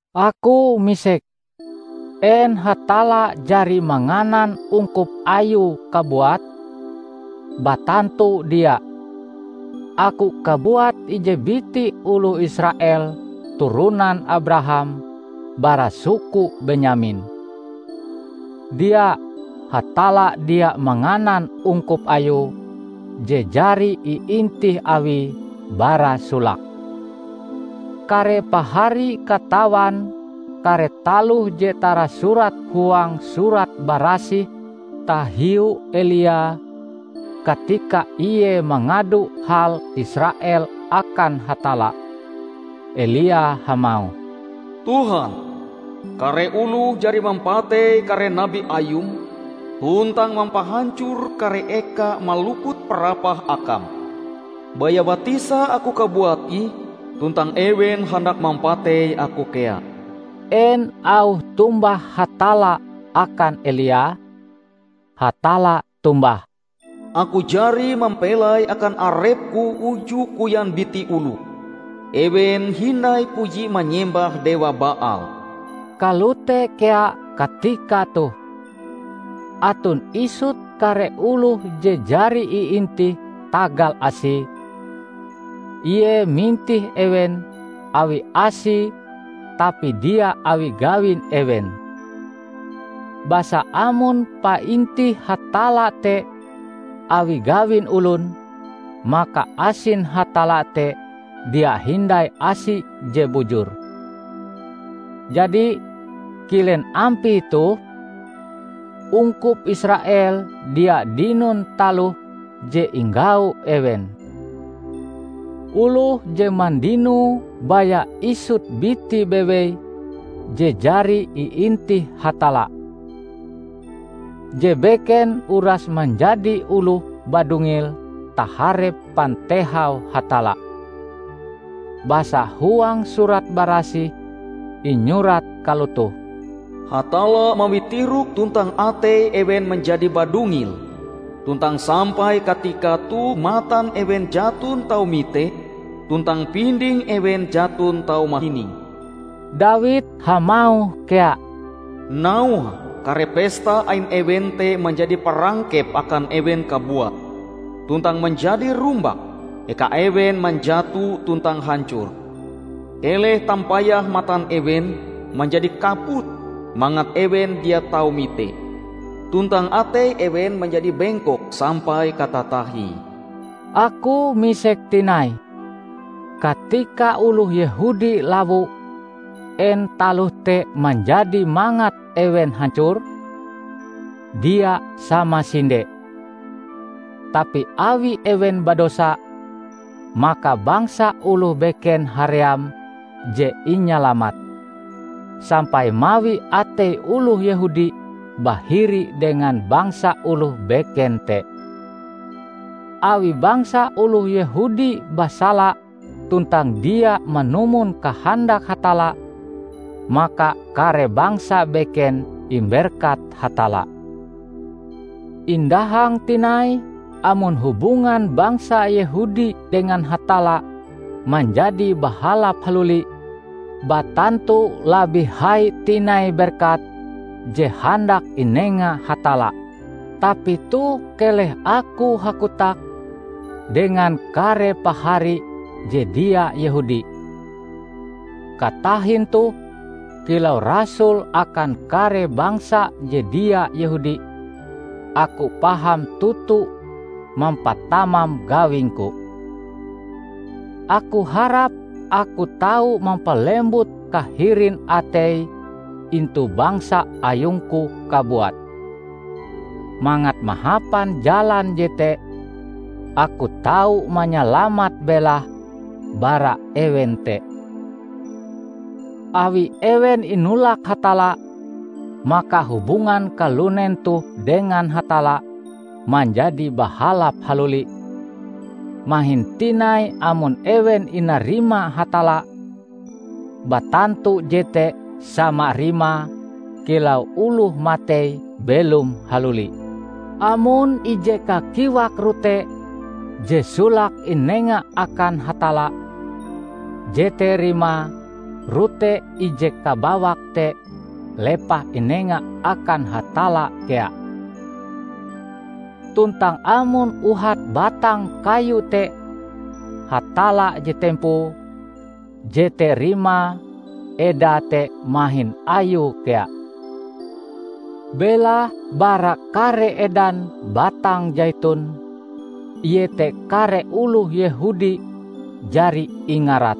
Aku misek: En Hatalla jari manganan ungkup Ayue kabuat? Batantu dia! Aku kabuat ije biti oloh Israel turonan Abraham bara suku Benyamin. Dia! Hatalla dia manganan ungkup Ayue je jari iintih Awie bara solake. Kare pahari katawan kare taloh je tarasurat huang Surat Barasih tahiu Elia, katika ie mangado hal Israel akan Hatalla. Elia hamauh, "Tuhan, kare oloh jari mampatei kare nabi Ayum tuntang mampahancor kare eka maluput parapah Akam. Baya batisa aku kabuat ih tuntang ewen handak mampatei aku kea." En auh tombah Hatalla akan Elia? Hatalla tombah, "Aku jari mampelai akan arep-Ku uju koyan biti oloh. Ewen hindai puji manyembah dewa Baal." Kalote kea katika toh: Aton isut kare oloh je jari iintih tagal Asie. Ie mintih ewen awi Asie tapi dia awi gawin ewen. Basa amon paintih Hatalla te awi gawin olon, maka asin Hatalla te dia hindai asi je bujur. Jadi, kilen ampie toh? Ungkup Israel dia dinon taloh je inggau ewen. Oloh je mandinoe baya isut biti bewei je jari iintih Hatalla. Je beken uras manjadi oloh badungil taharep pantehau Hatalla. Basa huang Surat Barasih inyurat kalotoh, "Hatalla mawi tirok tuntang atei ewen manjadi badungil; tuntang sampai katika toh matan ewen jaton tau mite tuntang pinding ewen jaton tau mahining." Dawid hamauh kea, "Nauhe kare pesta ain ewen te manjadi parangkep akan ewen kabuat, tuntang manjadi rumbak, eka ewen manjato tuntang hancor! Keleh tampayah matan ewen manjadi kaput mangat ewen dia tau mite; tuntang atei ewen manjadi bingkok sampai katatahie." Aku misek tinai: Katika oloh Yehudi lawo, en taloh te manjadi mangat ewen hancor? Dia samasinde! Tapi awi ewen badosa, maka bangsa oloh beken haream je inyalamat, sampai mawi atei oloh Yehudi bahiri dengan bangsa oloh beken te. Awi bangsa oloh Yehudi basala tuntang dia manumon kahandak Hatalla, maka kare bangsa beken imberkat Hatalla. Indahang tinai amon hubungan bangsa Yehudi dengan Hatalla manjadi bahalap haluli; batantu labih hai tinai berkat je handak inenga Hatalla! Tapi toh keleh aku hakotak dengan kare pahari je dia Yehudi! Katahin toh, kilau rasul akan kare bangsa je dia Yehudi, aku paham toto mampatamam gawingku. Aku harap aku tau mampalembut kahirin atei intu bangsa ayungku kabuat, mangat mahapan jalan jete aku tau manyalamat belahe bara ewen te. Awi ewen inolak Hatalla, maka hubungan kalunen toh dengan Hatalla manjadi bahalap haluli; mahin tinai amon ewen inarima Hatalla! Batantu jete sama rimae kilau oloh matei belom haluli! Amon ije kakiwak rote je solake inenga akan Hatalla, jete rimae rote ije kabawak te lepah inenga akan Hatalla kea. Tuntang amon uhat batang kayu te Hatalla je tempoe, jete rimae edae te mahin Ayue kea. Belahe bara kare edan batang saitun -- iete kare oloh Yehudi -- jari ingarat.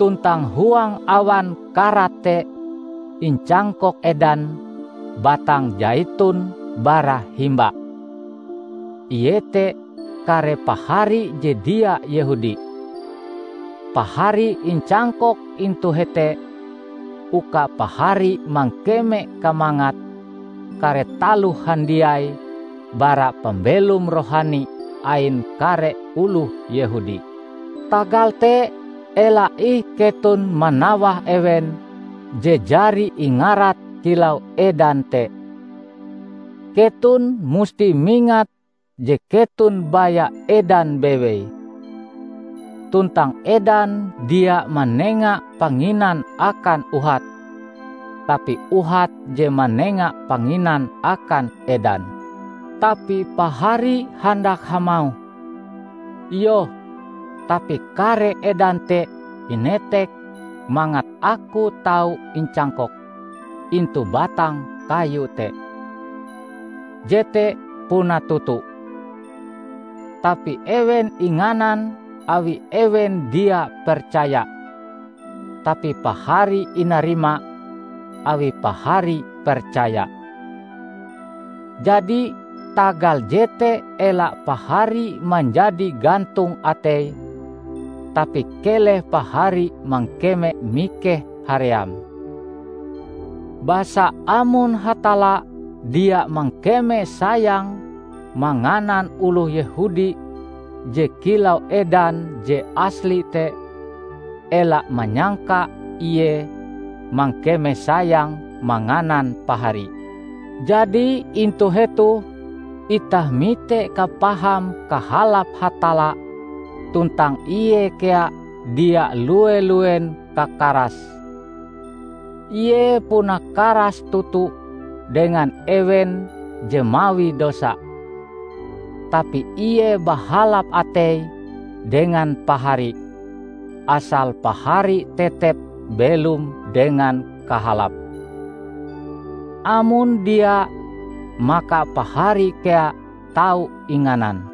Tuntang huang awan karat te incangkok edan batang saitun bara himba, ie te kare pahari je dia Yehudi. Pahari incangkok intu hete uka pahari mangkeme kamangat kare taloh handiai bara pambelom rohani ain kare oloh Yehudi. Tagal te ela ih keton manawah ewen je jari ingarat kilau edan te. Keton musti mingat je keton baya edan bewei. Tuntang edan dia manenga panginan akan uhat, tapi uhat je manenga panginan akan edan. Tapi pahari handak hamauh, "Iyoh, tapi kare edan te inetek mangat aku tau incangkok intu batang kayu te!" Jete puna toto. Tapi ewen inganan awi ewen dia percaya, tapi pahari inarima awi pahari percaya. Jadi tagal jete ela pahari manjadi gantong atei: tapi keleh pahari mangkeme mikeh haream. Basa amon Hatalla dia mangkeme sayang manganan oloh Yehudi je kilau edan je asli te, ela manyangka Ie mangkeme sayang manganan pahari! Jadi intu hetoh itah mite kapaham kahalap Hatalla tuntang Ie kea dia lue-luen kakarase. Ie puna karas toto dengan ewen je mawi dosa, tapi Ie bahalap ateie dengan pahari -- asal pahari tetep belom dengan kahalap. Amon dia maka pahari kea tau inganan.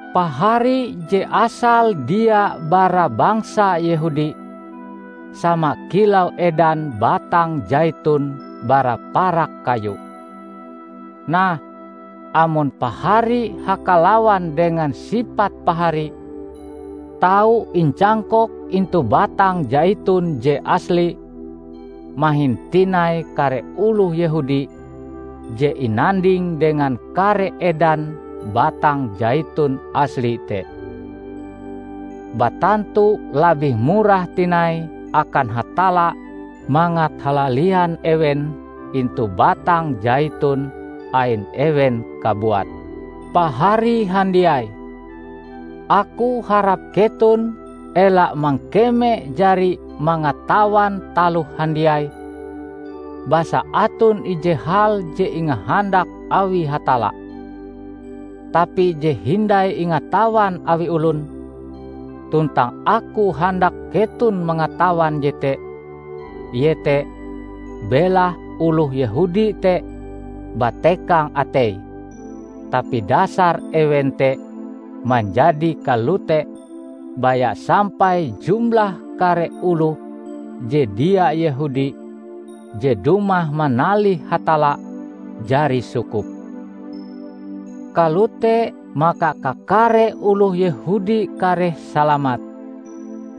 Pahari je asale dia bara bangsa Yehudi, sama kilau edan batang saitun bara parak kayu. Nah, amon Pahari hakalawan dengan sipat pahari, tau incangkok intu batang saitun je asli, mahin tinai kare oloh Yehudi je inanding dengan kare edan batang saitun asli te. Batantu labih murah tinai akan Hatalla mangat halalian ewen intu batang saitun ain ewen kabuat. Pahari handiai! Aku harap keton ela mangkeme jari mangatawan taloh handiai. Basa aton ije hal je ingahandak awi Hatalla, tapi je hindai ingatawan awi olon. Tuntang aku handak keton mangatawan jete; iete: belahe oloh Yehudi te batekang ateie, tapi dasar ewen te manjadi kalote baya sampai jumlah kare oloh je dia Yehudi je dumah manalih Hatalla jari sukup. Kalote maka kakare oloh Yehudi kareh salamat.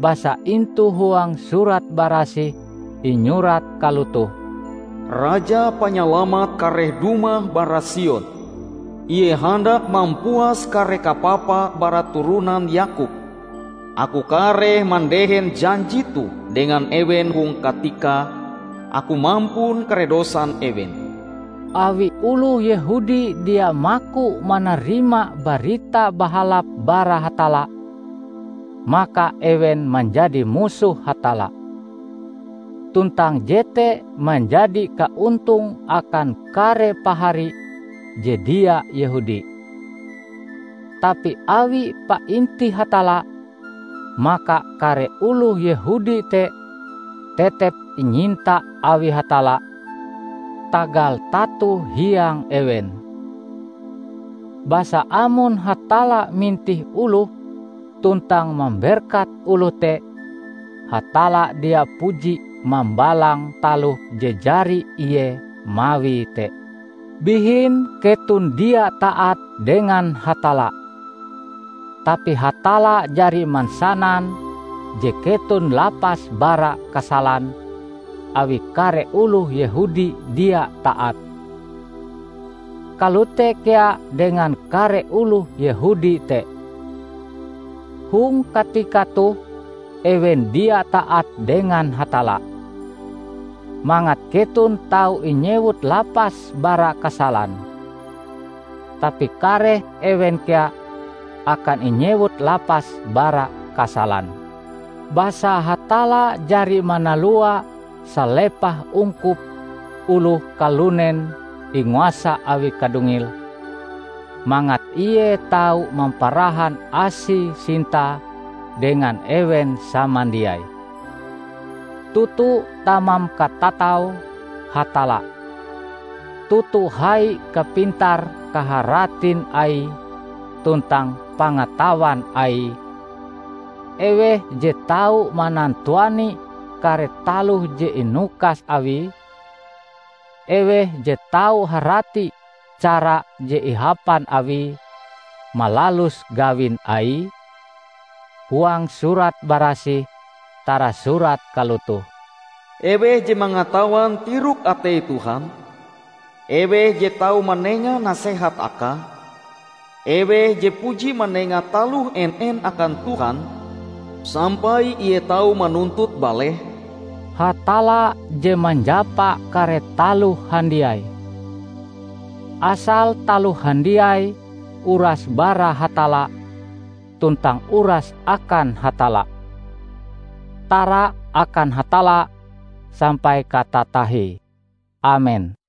Basa intu huang Surat Barasih inyurat kalotoh, "Raja Panyalamat kareh dumah bara Sion; ie handak mampuas kare kapapa bara turonan Yakob. Aku kareh mandehen janji toh dengan ewen hong katika Aku mampun kare dosan ewen." Awi oloh Yehudi dia maku manarima Barita Bahalap bara Hatalla, maka ewen manjadi musoh Hatalla; tuntang jete manjadi kaontong akan kare pahari je dia Yehudi. Tapi awi paintih Hatalla, maka kare oloh Yehudi te tetep inyinta awi Hatalla tagal tato hiang ewen. Basa amon Hatalla mintih oloh tuntang mamberkat oloh te, Hatalla dia puji mambalang taloh je jari Ie mawie te. Bihin keton dia taat dengan Hatalla. Tapi Hatalla jari mansanan je keton lapas bara kasalan, awi kare oloh Yehudi dia taat. Kalote kea dengan kare oloh Yehudi te. Hong katika toh ewen dia taat dengan Hatalla, mangat keton tau inyewut lapas bara kasalan. Tapi kareh ewen kea akan inyewut lapas bara kasalan. Basa Hatalla jari manalua salepah ungkup oloh kalunen inguasa awi kadungil, mangat Ie tau mamparahan Asie-Sintae dengan ewen samandiai. Toto tamam katatau Hatalla! Toto hai kapintar-kaharatin Aie tuntang pangatawan Aie! Eweh je tau manantuani kare taloh je inukas Awie? Eweh je tau harati cara je ihapan Awie malalus gawin Aie? Huang Surat Barasih tarasurat kalotoh, "Eweh je mangatawan tirok-atei Tuhan? Eweh je tau manenga nasehat Akae? Eweh je puji manenga taloh en-en akan Tuhan sampai Ie tau manuntut balehe?" Hatalla je manjapa kare taloh handiai. Asal taloh handiai uras bara Hatalla tuntang uras akan Hatalla. Tara akan Hatalla sampai katatahie! Amen.